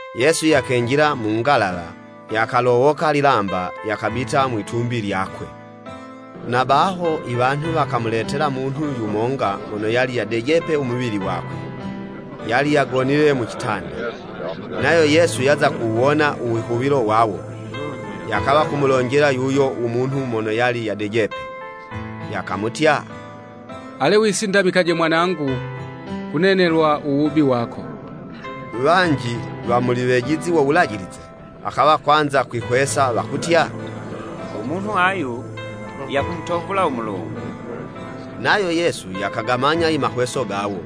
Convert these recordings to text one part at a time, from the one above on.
Yesu yakenjila mu ngalawa, yakalowoka lilamba, yakabita mwitumbi lyakwe. Na baho, iwanhu wakamuletela munhu yumonga mono yali yadejepe u muwili wakwe, yali yagonile mu citanda. Nayo Yesu yaza kuwuwona u wihuwilo wawo, yakawa kumulonjela yuyo u munhu mono yali yadejepe, yakamutya, “Ale wisindamikaje mwanangu! Kunenelwa u wubi wako.” Wanji wa muli wejizi wo Wulajilize, wakawa kwanza kwihwesa wakutya, “U munhu ayu yakumutovula u Mulungu!” Nayo Yesu yakagamanya i mahweso gawo,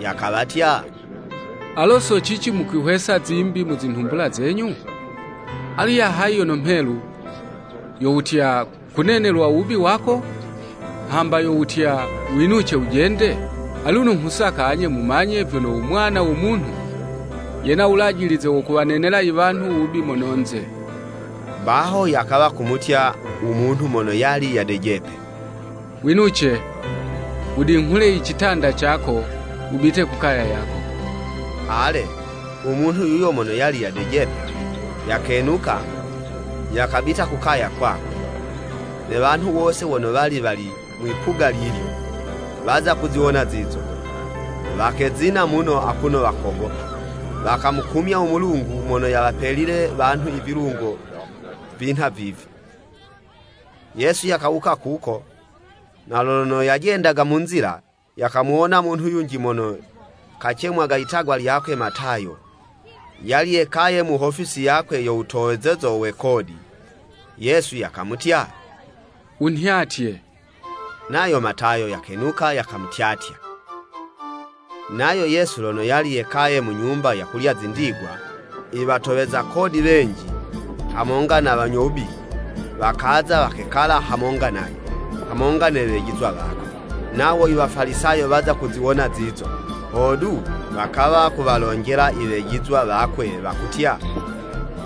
yakawatya, “Alo so cici mukwihwesa zimbi mu zinhumbula zenyu? Alu ya hayi yono mhelu, yo wutya, ‘Kunenelwa uwubi wako,’ hamba yo wutya, ‘Winuce wujende?’ Aluno nghusaka anye mumanye vyono u Mwana wo Munhu yena wulajilize wo kuwanenela iwanhu wubi mono'nze.” Baho yakawa kumutya u munhu mono yali yadejepe, “Winuce, wudinghule icitanda cako wubite kukaya yako.” Ale, u munhu yuyo mono yali yadejepe, yakenuka, yakabita ku kaya kwakwe. Ne wanhu wose wono wali wali mwi'puga lilyo, waza kuziwona zizo, wakezina muno akuno wakogopa, wakamukumya u Mulungu mono yawapelile wanhu ivilungo vinha vivi. Yesu yakawuka kuko, na lono yajendaga mu nzila, yakamuwona munhu yunji mono kacemwaga itagwa lyakwe, Matayo, yali yekaye mu hofisi yakwe yo wutowezezo we kodi. Yesu yakamutya, “Wunhyatye.” Nayo Matayo yakenuka yakamutyatya. Nayo Yesu lono yali yekaye mu nyumba yakulya zindigwa, iwatoweza kodi wenji, hamonga ne wanyo wubi, wakaza, wakekala hamonga nayo, hamonga ne wejizwa wakwe. Nawo i Wafalisayo waza kuziwona zizo, hodu wakawa kuwalonjela iwejizwa wakwe wakutya,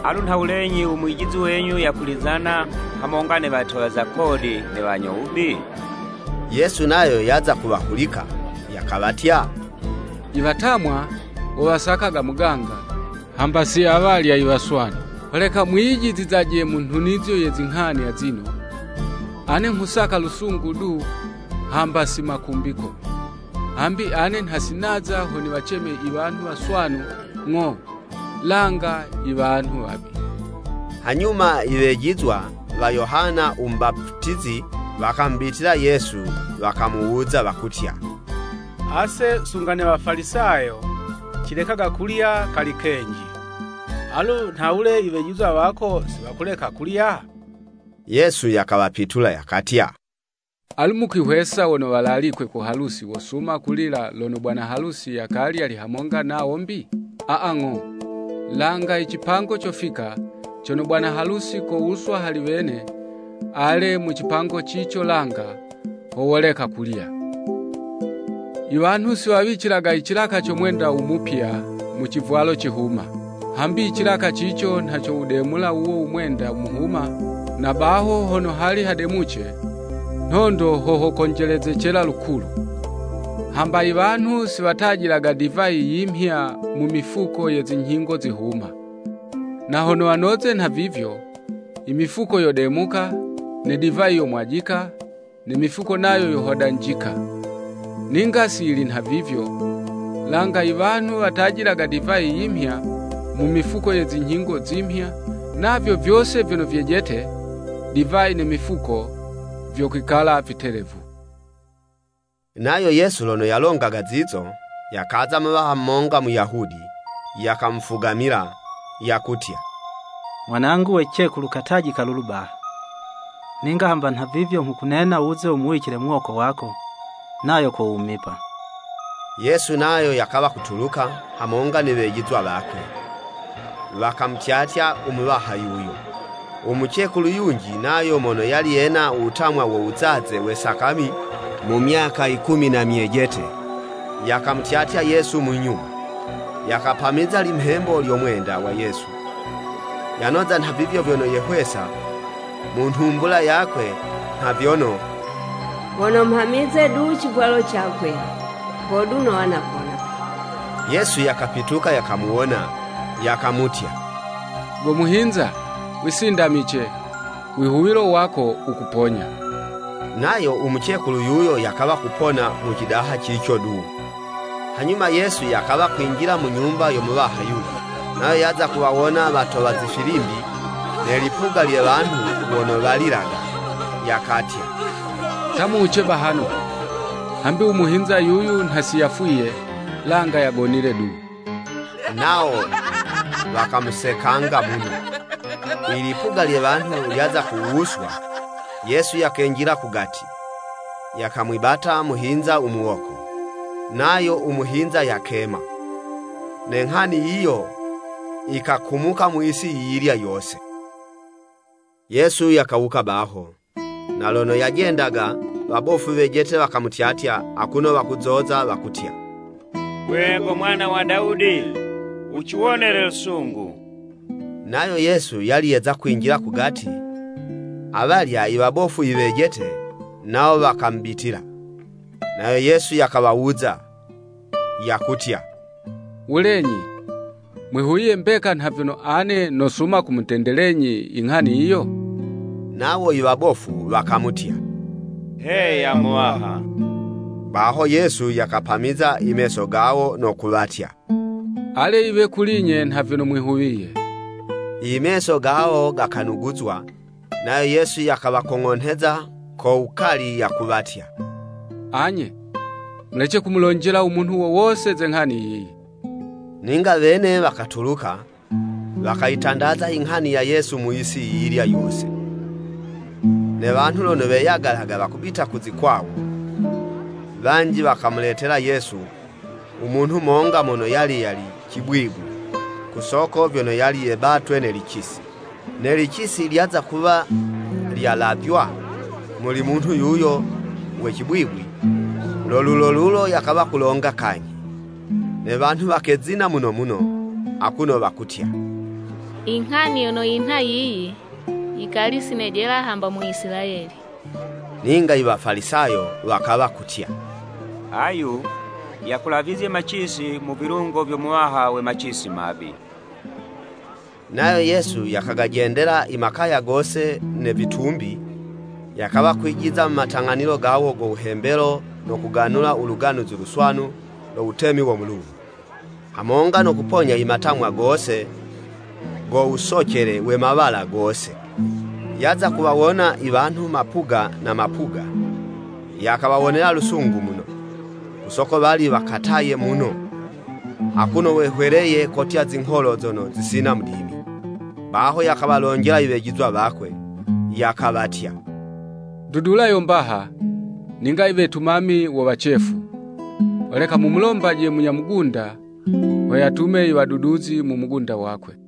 “Alu nhawulenyi u Mwijizi wenyu yakulizana, hamonga ne watoweza kodi ne wanyo wubi?” Yesu nayo yaza kuwahulika, yakawatya, “Iwatamwa, wo wasakaga muganga, hamba si awalya iwaswanu. Holeka mwiyijizizaje mu nhunizo ye zinghani azino, ‘Ane nghusaka lusungu du, hamba si makumbiko.’ Hambi ane nha si naza ho niwaceme iwanhu waswanu, ng'o, langa iwanhu wabi.” Hanyuma i wejizwa wa Yohana u Mubaputizi, wakamubitila Yesu wakamuwuza wakutya, “Ase sunga ne Wafalisayo, cilekaga kulya kali kenji, Alu nhawule i wejizwa wako si wakuleka kulya?” Yesu yakawapitula yakatya, “Alu mukwihwesa wono walalikwe ku halusi wosuma kulila, lono bwana halusi yakali yali hamonga nawo 'mbi? Aa, ng'o, langa icipango cofika cono bwana halusi kowuswa hali wene, ale mu cipango cico langa, ho woleka kulya. “Iwanhu si wawicilaga icilaka co mwenda u mupya, mu civwalo cihuma. Hambi icilaka cico nha cowudemula wuwo u mwenda muhuma, na baho hono hali hademuce, nhondo ho hokonjelezecela lukulu. Hamba iwanhu si watajilaga divayi yimhya mu mifuko ye zinyhingo zihuma. Na hono wanoze nhavivyo, imifuko yodemuka, ne divayi yomwajika, ne mifuko nayo yohodanjika. Ninga si yili nhavivyo, langa iwanhu watajilaga divayi yimhya, mu mifuko ye zinyhingo zimhya, navyo vyose vyono vyejete, divayi ne mifuko vyokwikala vitelevu.” Nayo Yesu lono yalongaga zizo, yakaza muwaha monga Muyahudi, yakamufugamila, yakutya, “Mwanangu we cicekulu katajika lulu baha. Ninga hamba nhavivyo nghukunena wuze wumuwicile muwoko wako, nayo kowumipa.” Yesu nayo yakawa kutuluka, hamonga ne wejizwa wakwe, wakamutyatya u muwaha yuyo. Umucekulu yunji nayo mono yali yena wutamwa wo wuzaze we sakami mu myaka yikumi na myejete, yakamutyatya Yesu mu nyuma, yakapamiza limhembo lyo mwenda wa Yesu. Yanoza nha vivyo vyono yehwesa mu nhumbula yakwe nha vyono, “Hono mhamize du icivwalo cakwe, hodu nowa napona.” Yesu yakapituka yakamuwona, yakamutya, “Go muhinza, wisindamice! Wihuwilo wako wukuponya.” Nayo u mucekulu yuyo yakawa kupona mu cidaha cico du. Hanyuma Yesu yakawa kwinjila mu nyumba yo muwaha yulya. Nayo yaza kuwawona watowa zifilimbi, ne lipuga lye wanhu wono walilaga, yakatya, “Ta muwuce bahano! Hambi u muhinza yuyu, nha si yafwiye, langa yagonile du.” Nawo wakamusekanga muno. Ilipuga lye wanhu lyaza kuwuswa, Yesu yakenjila kugati, yakamwibata muhinza u muwoko, nayo u muhinza yakema. Ne nghani yiyo yikakumuka mu yisi yiyilya yose. Yesu yakawuka baho, na lono yajendaga, wabofu wejete wakamutyatya akuno wakuzoza wakutya, “Gwe go Mwana wa Dawudi, wuciwonele lusungu!” Nayo Yesu yali yeza kwinjila kugati, awalya i wabofu iwejete nawo wakamubitila, nayo Yesu yakawawuza yakutya, “Wulenyi, mwihuwiye mbeka nha vyono ane nosuma kumutendelenyi inghani yiyo?” Nawo i wabofu wakamutya, “Heya Muwaha.” Baho Yesu yakapamiza imeso gawo no kuwatya, “Ale yiwe kuli'nye nha vyono mwihuwiye.” Imeso gawo gakanuguzwa. Nayo Yesu yakawakong'onheza ko wukali yakuwatya, “Anye, mulece kumulonjela u munhu wo wose ze nghani yiyi.” Ninga wene wakatuluka, wakayitandaza inghani ya Yesu mu yisi yiyilya yose. Ne wanhu lono weyagalaga wakubita ku zikwawo, wanji wakamuletela Yesu, u munhu monga mono yali yali cibwibwi, ku soko vyono yali yebatwe ne licisi. Ne licisi lyaza kuwa lyalavywa muli munhu yuyo we cibwibwi, lo lulo lulo yakawa kulonga kanyhi. Ne wanhu wakezina muno muno akuno wakutya, “Inghani yono yinha yiyi, yikali si nejela hamba mu Isilayeli!” Ninga i Wafalisayo wakawa kutya, “Ayu yakulavizye macisi mu vilungo vyo muwaha we macisi mabi.” Nayo Yesu yakagajendela i makaya gose ne vitumbi, yakawa kwijiza mu matang'anilo gawo go wuhembelo no kuganula u Luganuzi Luswanu lo Wutemi wo Mulungu, hamonga no kuponya imatamwa gose go wusocele we mawala gose. Yaza kuwawona iwanhu mapuga na mapuga, yakawawonela lusungu muno, ku soko wali wakataye muno, akuno wehweleye kotya zingholo zono zisina mudimi. Baho yakawalonjela iwejizwa wakwe, yakawatya, “Ndudula yo mbaha, ninga iwetumami wo wacefu. Holeka mumulombaje munya mugunda, ho yatume iwaduduzi mu mugunda wakwe.”